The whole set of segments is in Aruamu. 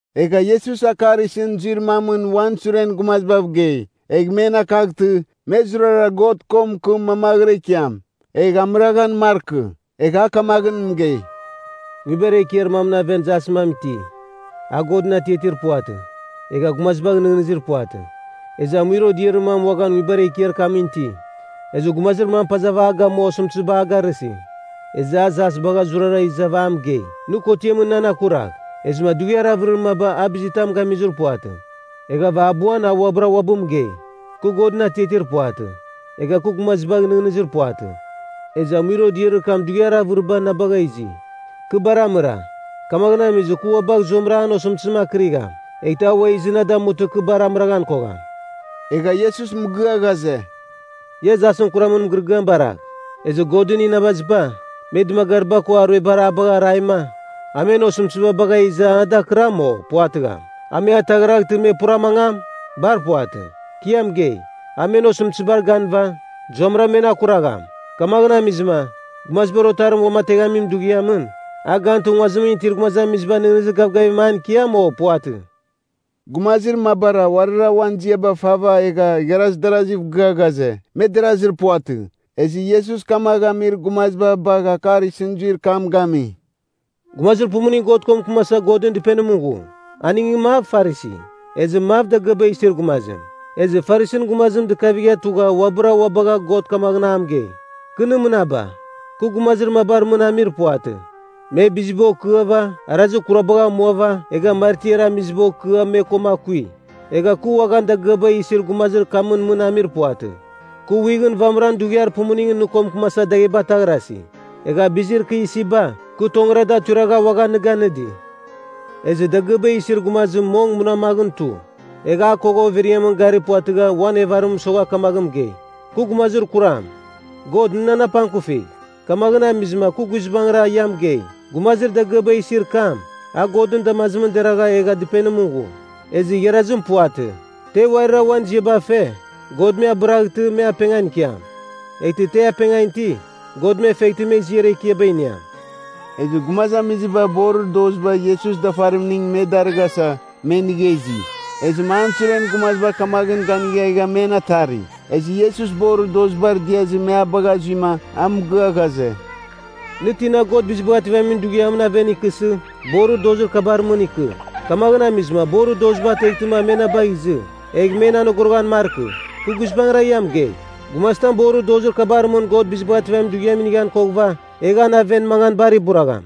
Egha Iesus akar isɨn zuir mamɨn uan suren gumazibav gei, egh men akaghtɨ, me zurara God ko mɨkɨm mamaghra ikiam. Egh amɨraghan markɨ. Egha a kamaghɨn mɨgei, “Nguibar ekiar mamɨn aven jasɨn mam iti, a Godɨn atiatir puvatɨ. Egha gumazibagh nɨghnɨzir puvatɨ. Ezɨ amuir odiarir mam uaghan nguibar ekiar kamɨn iti. Ezɨ gumazir mam pazava a gamua osɨmtɨziba a garɨsi. Ezɨ a jas bagha zurara izava a mɨgei, ‘Nɨ kotiamɨn nan akuragh.’ “Ezɨma dughiar avɨrir maba a bizitam gamizir puvatɨ. Eghava abuan a uabɨra uabɨ mɨgei, ‘Kɨ Godɨn atiatir puvatɨ. Egha kɨ gumazibagh nɨghnɨzir puvatɨ. Ezɨ amuir odiarir kam dughiar avɨribar na bagha izi. Kɨ bar amɨra. Kamaghɨn amizɨ, kɨ ua bagh zuamɨra an osɨmtɨzim akɨrigham, eghtɨ a ua izɨ na damutɨma kɨ bar amɨraghan kogham!’” Egha Iesus mɨgɨa ghaze, “Ia jasɨn kuramɨn mɨgɨrɨgɨam baragh. Ezɨ Godɨn inabaziba, me dɨmagariba ko aruebar a bagha araima, a men osɨmtɨziba bagha iza a da akɨram, o puvatɨgham? A me ataghraghtɨ me pura mangam? Bar puvatɨ. Kɨ ia mɨgei, a men osɨmtɨzibar ganɨva, zuamɨra men akuragham. Kamaghɨn amizɨma, Gumazibar Otarim uamateghamin dughiamɨn, a gantɨ, nguazimɨn itir gumazamiziba nɨghnɨzir gavgavim an ikiam, o puvatɨ?” Gumazir mabara uarira uan ziaba fava egha igharaz daraziv gɨa ghaze, me derazir puvatɨ. Ezɨ Iesus kamagh amir gumaziba bagh akar isɨn zuir kam gami, “Gumazir pumuning God ko mɨkɨmasa Godɨn Dɨpenimɨn ghu, aningɨn mav Farisi, ezɨ mav dagɨaba isir gumazim. Ezɨ Farisin gumazim dɨkavigha tugha uabɨra ua bagha God kamaghɨn a mɨgei, ‘Kɨ nɨ mɨnaba, kɨ gumazir mabar mɨn amir puvatɨ. Me biziba okɨava, arazir kurabagh amuava egha martiar amiziba okɨa me koma akui. Egha kɨ uaghan dagɨaba isi gumazir kamɨn mɨn amir puvatɨ. Kɨ wighɨn vamɨran dughiar pumuningɨn nɨ ko mɨkɨmasa dagheba ataghrasi. Egha bizir kɨ isiba, kɨ tongɨra da tuiragha uaghan nɨ ganɨdi.’ Ezɨ dagɨaba isir gumazim mong munamaghɨn tu. Egha a kogha overiamɨn gari puvatɨgha uan evarim mɨsogha kamaghɨn mɨgei, ‘Kɨ gumazir kuram, God nɨ nan apangkufigh!’ Kamaghɨn amizɨma kɨ guizbangɨra ia mɨgei, gumazir dagɨaba isir kam, a Godɨn damazimɨn deragha egha dɨpenimɨn ghu. Ezɨ igharazim puvatɨ. Te uarira uan ziaba fe, God me abɨraghtɨ, me apengan ikiam. Eghtɨ te apengan iti, God me feghtɨ me ziar ekiaba iniam.” Ezɨ gumazamiziba borir doziba Iesus dafarimning me darɨghasa, me inigha izi. Ezɨma an suren gumaziba kamaghɨn ganigha egha men atari. Ezɨ Iesus borir dozibar diazɨ me a bagha zuima a mɨgɨa ghaze, “Nɨ tina God Bizibagh Ativamin Dughiamɨn aven ikɨsɨ, borir dozir kabar mɨn ikɨ. Kamaghɨn amizɨma borir doziba ateghtɨma me na bagh izɨ, egh men anogoroghan markɨ. Kɨ guizbangɨra ia mɨgei, gumazitam borir dozir kabar mɨn God Bizibagh Ativamin Dughiam inighan koghɨva, egh an aven mangan bar iburagham.”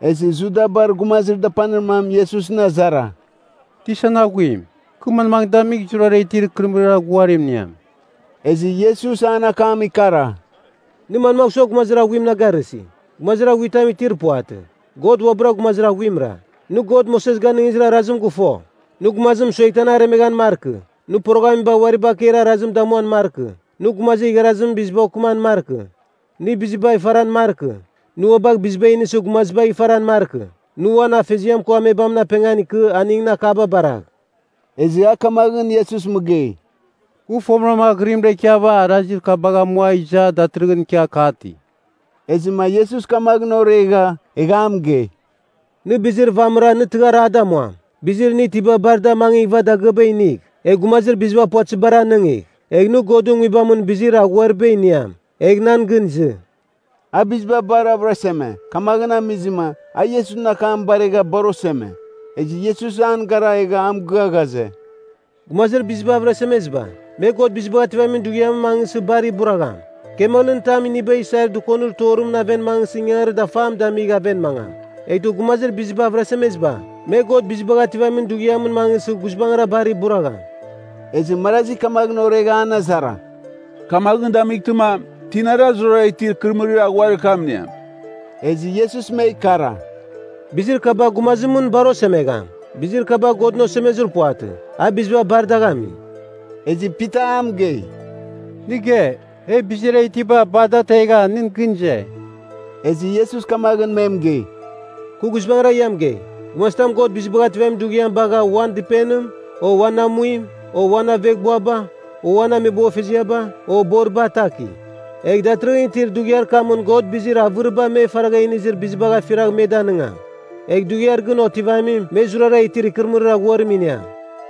Ezɨ Judabar gumazir dapanir mam Iesusɨn azara, “Tisan Aghuim, kɨ manmaghɨn damigh zurara itir ikɨrɨmɨrir aghuarim iniam?” Ezɨ Iesus an akam ikara, “Nɨ manmagh sua gumazir aghuim na garɨsi? Gumazir aghuitam itir puvatɨ. God uabɨra gumazir aghuimra. Nɨ God Moses ganɨngizir arazim gɨfo, ‘Nɨ gumazim mɨsueghtɨ an aremeghan markɨ, nɨ poroghamiba uari bakeir arazim damuam markɨ, nɨ gumazir igharazimɨn biziba okɨman markɨ, nɨ bizibagh ifaran markɨ, nɨ ua bagh biziba inisɨ gumazibagh ifaran markɨ, nɨ uan afeziam ko amebamɨn apengan ikɨ aningɨn akaba baragh.’” Ezɨ a kamaghɨn Iesus mɨgei, “Kɨ fomɨram aghɨrimra ikiava arazir kabagh amua iza datɨrɨghɨn ikia kati.” Ezɨma Iesus kamaghɨn oregha, egha a mɨgei, “Nɨ bizir vamɨra nɨ tɨghar a damuam. Bizir nɨ itiba bar da amangighɨva dagɨaba inigh, egh gumazir biziba puvatɨzibar anɨngigh. Egh nɨ Godɨn Nguibamɨn bizir aghuariba iniam. Egh, nan gɨn izɨ.” A biziba bar avɨraseme, kamaghɨn amizɨma, a Iesusɨn akam baregha bar oseme. Ezɨ Iesus an gara egha a mɨgɨa ghaze, “Gumazir biziba avɨrasemeziba, me God Bizibagh Ativamin Dughiamɨn mangɨsɨ bar iburagham! Kamelɨn tam iniba isair dɨkonir torimɨn aven mangɨsɨ ingangarir dafam damigh aven mangam. Eghtɨ gumazir biziba avɨrasemeziba, me God Bizibagh Ativamin Dughiamɨn mangɨsɨ guizbangɨra bar iburagham!” Ezɨ marazi kamaghɨn oregha an azara, “Kamaghɨn damightɨma, tinara zurara itir ikɨrɨmɨrir aghuir kam iniam?” Ezɨ Iesus me ikara, “Bizir kaba gumazimɨn bar osemegham. Bizir kaba Godɨn osemezir puvatɨ. A biziba bar dagh ami.” Ezɨ Pita a mɨgei, “Nɨ ge, e bizir e itiba bar da ategha, nɨn gɨn ize.” Ezɨ Iesus kamaghɨn me mɨgei, “Kɨ guizbangɨra ia mɨgei, gumazitam God Bizibagh Ativamin Dughiam bagha uan dɨpenim, o uan amuim, o aveghbuaba, o ameboghfeziaba, o boriba ataki, egh datɨrɨghɨn itir dughiar kamɨn God bizir avɨriba me faragha inizir bizibagh afiragh me danɨngam. Egh dughiar gɨn otivamim me zurara itir ikɨrɨmɨrir aghuarim iniam.”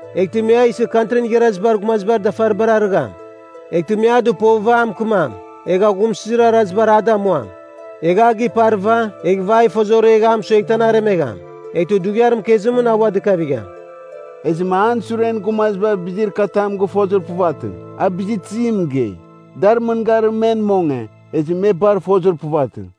Eghtɨ me a isɨ Kantrin Igharazibar Gumazibar dafaribar arɨgham. Eghtɨ me a dɨpova a mɨkɨmam. Egh aghumsɨzir arazibar a damuam. Egh a giparɨva, eghɨva a ifozoregh egh a mɨsueghtɨ an aremegham. Eghtɨ dughiar mɨkezim a ua dɨkavigham.” Ezɨma an suren gumaziba bizir katam gɨfozir puvatɨ, a bizir tizim mɨgei. Dar mɨngarim men monge, ezɨ me bar fozir puvatɨ.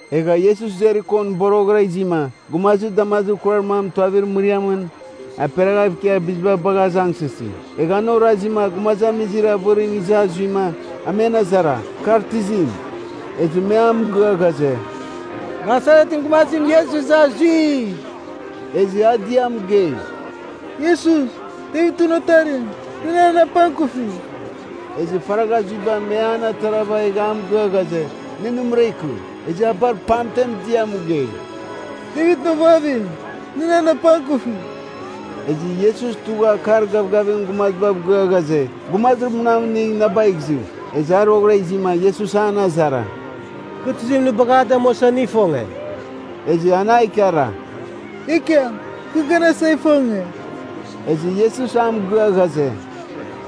Egha Iesus Jerikon boroghɨra izima, gumazir damazir kurar mam tuavir mɨriamɨn aperaghav ikia biziba bagha azangsɨsi. Egha an orazima gumazamizir avɨrim iza zuima, a men azara, kar tizim. Ezɨ me a mɨgɨa ghaze, “Nasaretɨn gumazim Iesus iza zui.” Ezɨ a dia mɨgei, “Iesus, Devitɨn Otarim, nɨ nan apangkufigh!” Ezɨ faragha zuiba me an atarava egha a mɨgɨa ghaze, nɨ nɨmɨra ikɨ. Ezɨ a bar pamtem dia mɨgei, “Devitɨn ovavim, nɨ nan apangkufigh!” Ezɨ Iesus tugha akar gavgavim gumazibav gɨa ghaze, “Gumazir munam inigh na bagh izɨ.” Ezɨ a roghɨra izima, Iesus an azara, “Kɨ tizim nɨ bagha a damuasa, nɨ ifonge?” Ezɨ an a ikara, “Ekiam, kɨ ganasa ifonge.” Ezɨ Iesus a mɨgɨa ghaze,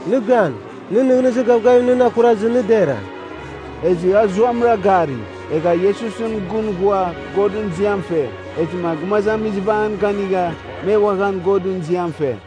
“Nɨ gan. Nɨn nɨghnɨzir gavgavim nɨn akurazɨ, nɨ dera.” Ezɨ a zuamɨra gari. Egha Iesusɨn gɨn ghua Godɨn ziam fe. Ezɨma gumazamiziba an ganigha, me uaghan Godɨn ziam fe.